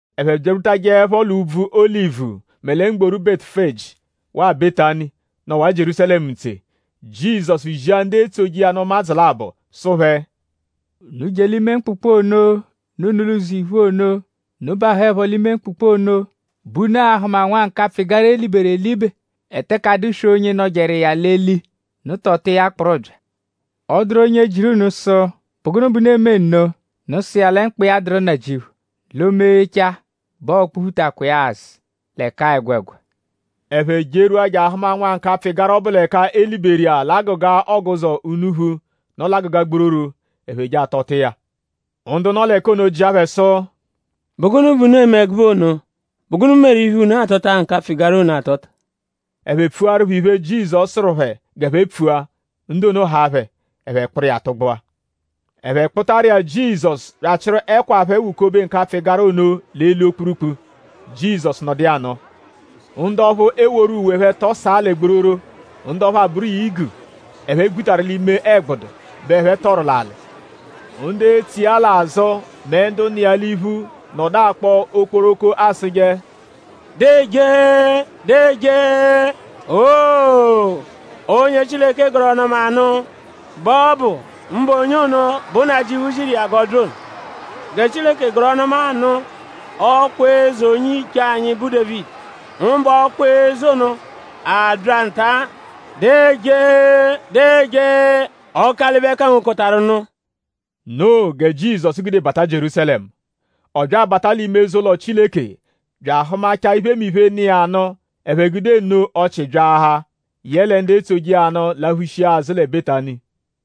Ẹphe byarwutajẹepho l'úbvú Olivu mẹ lẹ mgboru Betufeji waa Betani, nọwaa Jierúsalẹmu ntse; Jizọsu zia ndu etsoje iya nụ ụmadzu labọ sụ phẹ: “Unu je l'ime mkpụkpu ono, nọ unu l'ụzo iphu ono. Unu -bahụepho l'ime mkpụkpu ono bẹ unu a-hụma nwa nkapfụ-ịgara, e liberu elibe, eteke adụswee onye nọjeru iya l'eli. Unu tọta iya kpụru bya. Ọ -dụru onye jịru unu sụ: ‘?Bụ gụnu bẹ unu eme nno?’ Unu sụ iya lẹ mkpa iya dụru Nnajịuphu; l'o -meghechaa bẹ ọo-kpụ-phutakwa iya-a azụ l'ẹka-a ẹgwegwa.” Ẹphe jerwua je ahụma nwa nkapfụ-ịgara ọbu l'ẹka e liberu l'agụga ọguzo unuphu, nọ l'agụga gbororo; ẹphe je atọta iya. Ndu nọ l'ẹka ono jịa phẹ sụ: “?Bụ gụnu bẹ unu eme ẹgube ono??Bụ gụnu meru iphe, unu atọta nkapfụ-ịgara ono atọta?” Ẹphe pfuaru phẹ iphe, Jizọsu sụru phẹ g'ẹphe pfua. Ndu ono haa phẹ; ẹphe kpụru iya tụgbua. Ẹphe kpụtaru iya Jizọsu bya achịru ẹkwa phẹ wukobe nkapfụ-ịgara ono l'eli okpurukpu; Jizọsu nọdu iya anọo. Ndu ọphu eworu uwe phẹ tọsaa lẹ gbororo; ndu ọphu abụru igu, ẹphe gbutaru l'ime ẹgbudu bẹ ẹphe tọru l'alị. Ndu etso iya l'azụ mẹ ndu nọ iya l'iphu nọdu akpọ okporoko asụje: “Deejee! Deejee! Owoo! Onye Chileke gọru ọnu-ọma nụ bẹ ọ bụ; mbụ onye ono, bụ Nnajịuphu ziru iya g'ọ bya ono. Gẹ Chileke gọru ọnu-ọma nụ ọkwa eze onye-iche anyi, bụ Dévidi; mbụ ọkwa eze ono, abya nta. Deejee! Deejee! Ọkalibe-kangokọtaru-nụ!” Noo gẹ Jizọsu gude bata Jierúsalẹmu. Ọ bya abata l'ime eze-ụlo Chileke bya ahụmachaa iphemiphe, nọ iya nụ. Ẹphe gude nno ọchii byaahaa. Yẹle ndu etsoje iya nụ laphushia azụ lẹ Betani.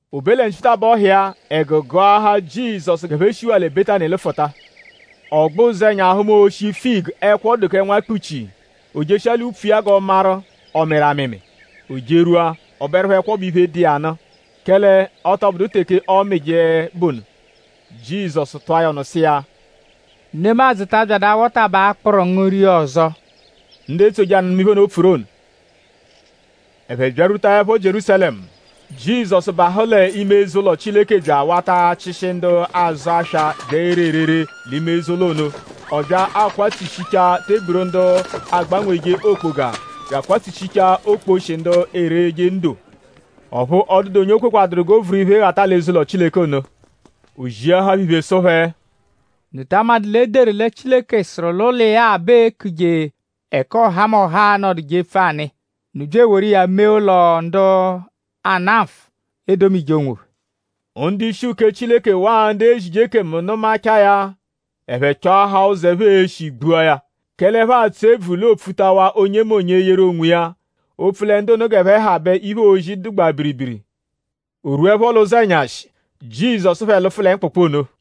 O be lẹ nchitabọhu iya; ẹgu gụahaa Jizọsu g'ẹphe shiwaa lẹ Betani lụfuta. Ọ gbẹ ụzenya hụma oshi figu, ẹkwo dụ kẹ nwa kpuchii. O jeshia l'upfu iya g'ọ maru:?ọ mịru amịmi. O jerwua; ọ bụerupho ẹkwo bụ iphe, dụ iya nụ; kẹle ọ tọ bụdu teke ọomije bụ ono. Jizọsu tụa ya ọnu sụ iya: “Nemadzụ ta abyadụ awọtabaa akpụru ngu ria ọzo.” Ndu etsoje iya nụ nụma iphe ono, o pfuru ono. Ẹphe byarwutaẹpho Jierúsalẹmu; Jizọsu bahụ l'ime eze-ụlo Chileke bya awata achịshi ndu azụ aswa bya ere erere l'ime eze-ụlo ono. Ọ bya akwatsushichaa teburu ndu agbanweje okpoga bya akwatsushichaa okposhi ndu ereje ndo. Ọphu ọ dụdu onye o kwekwaduru g'o vuru iphe ghata l'eze-ụlo Chileke ono. O ziahaa phẹ iphe sụ phẹ: “?Unu ta amadụ l'e deru lẹ Chileke sụru l'ụlo iya bẹ ee-kuje ẹka ọhamoha a-nọduje epfu anụ iya. Unu bya eworu iya mee ụlo, ndu ana nfụ edomije onwophẹ.” Ndu-ishi uke Chileke waa ndu ezije ekemu nụmachaa ya; ẹphe chọahaa ụzo, ẹphe e-shi gbua ya. Kẹle ẹphe atsụ ebvu l'oopfutawaa onyemonye eyeru onwiya; opfu lẹ ndu ono g'ẹphe ha bẹ iphe, oozi dụgbaa biribiri. O -rwuẹpho l'ụzenyashi; Jizọsu phẹ lụfu lẹ mkpụkpu ono.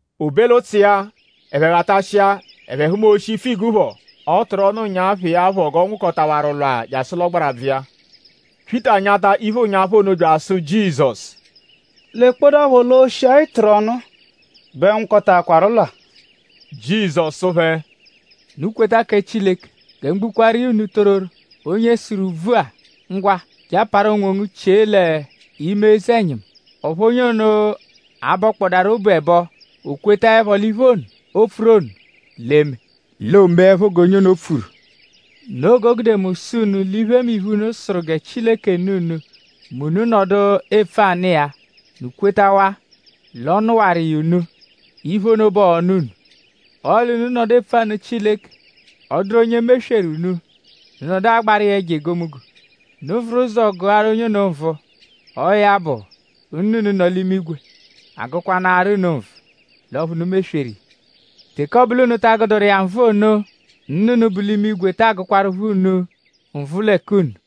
O be l'ụtsu iya; ẹphe ghatashia; ẹphe hụma oshi figu phọ, ọ tụru ọnu ụnyaphu iya phọ g'ọ nwụkotawaru lwaa jasụ l'ọgbarabvu iya. Pyịta nyata iphe ụnyaphu ono bya asụ Jizọsu: “Lekpọdapho l'oshi-a, ị tụru ọnu-a bẹ nwụkotaakwaru lwaa.” Jizọsu sụ phẹ: “Unu kweta kẹ Chileke! Gẹ mu gbukwaaru iya unu tororo; onye sụru úbvú-a: ‘Ngwa; je aparu onwongu chie l'ime eze-ẹnyimu’ ọphu onye ono abọkpodaaru obu ẹbo; o kwetaẹpho l'iphe ono, o pfuru ono l'e-me; l'oomeẹpho g'onye ono pfuru. Noo g'o gude mu sụ unu l'iphemiphe, unu sụru gẹ Chileke nụ unu mẹ unu -nọdu epfu anụ iya; unu -kwetawaa l'ọ nụwaru iya unu; iphe ono bẹ ọo-nụ unu. Ọle unu -nọdu epfu anụ Chileke; ọ -dụru onye mesweru unu; unu nọdu agbaru iya ẹjo egomunggo; unu vuru ụzo gụaru onye ono nvụ; ọo ya bụ; Nna unu, nọ l'imigwe agụkwanaaru unu nvụ l'ọphu unu mesweru iya. Teke ọ bụ l'unu ta agụduru iya nvụ ono; Nna unu, bu l'imigwe taa gụkwarupho unu nvụ lẹ k'unu.”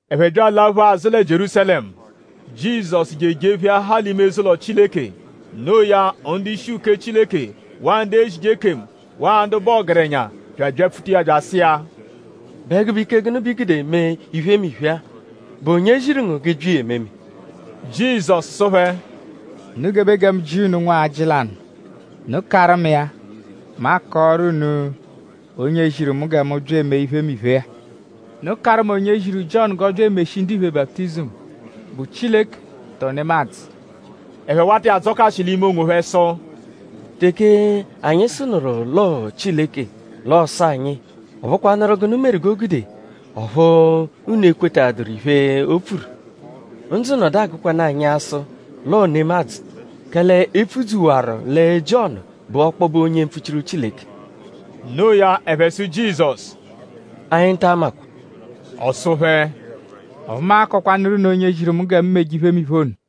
Ẹphe bya alaphukwa azụ lẹ Jierúsalẹmu. Jizọsu je ejepheahaa l'ime eze-ụlo Chileke. Noo ya; ndu-ishi uke Chileke; waa ndu ezije ekemu; waa ndu bụ ọgerenya bya abyapfuta iya bya asụ iya: “?Bụ ẹgube ike gụnu bẹ i gude eme iphemiphe-a??Bụ onye ziru ngu g'ị bya iya ememe?” Jizọsu sụ phẹ: “Unu gebe gẹ mu jịa unu nwajị lanụ. Unu -karụ mu iya; mu akọoru unu onye ziru mu gẹ mu bya eme iphemiphe-a. Unu karụ mu onye ziru Jiọnu g'ọ bya emeshi ndiphe baputizimu:?Bụ Chileke tọo nemadzụ?” Ẹphe wata iya adzọkashi l'ime onwophẹ sụ: “Teke anyi sụnuru l'ọo Chileke; l'ọ sụ anyi: ‘?Ọ bụkwanuru gụnu meru g'o gude ọphu unu ekwetaduru iphe, o pfuru?’ Ndzụ nọdu agụkwanu anyi asụ l'ọo nemadzụ; kẹle e pfudzuwaru lẹ Jiọnu bụ ọkpobe onye mpfuchiru Chileke.” Noo ya ẹphe sụ Jizọsu: “Anyi ta amakwa.” Ọ sụ phẹ: “Ọphu mu a-kọkwanuru unu onye ziru mu gẹ mu meje iphemiphe ono.”